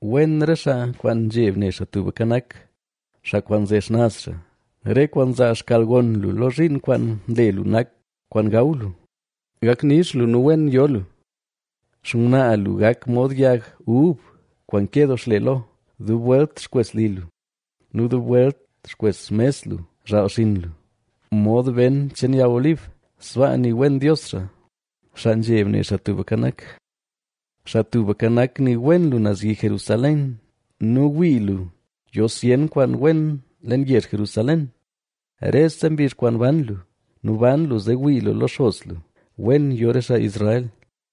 Wen re xaa kwaan nzheb ne Xaa Tubka Nak, xaa kwaan nze xnaz xaa. Re kwaan nzaa xkalgon lu lo zhiin kwaan nle lu nak kwaan gaw lu, gak nix lu nu wen yo lu. Xngwnaa lu gak mod yag ub kwaan ke doo xle lo dub welt xkwes li lu; nu dub welt xkwes xmes lu zhaal xinn lu mod ben cheen yag olib. Sbaa nii wen Dios xaa, xaa nzheb ne Xaa Tubka Nak. Xaa Tubka Nak, nii wen lu naz yi Jerusalén nu wii lu yo zyen kwaan wen leen yezh Jerusalén, rese mbizh kwaan ban lu. Nu ban lu zee wii lu lo xos lu. ¡Wen yo re xaa Israel!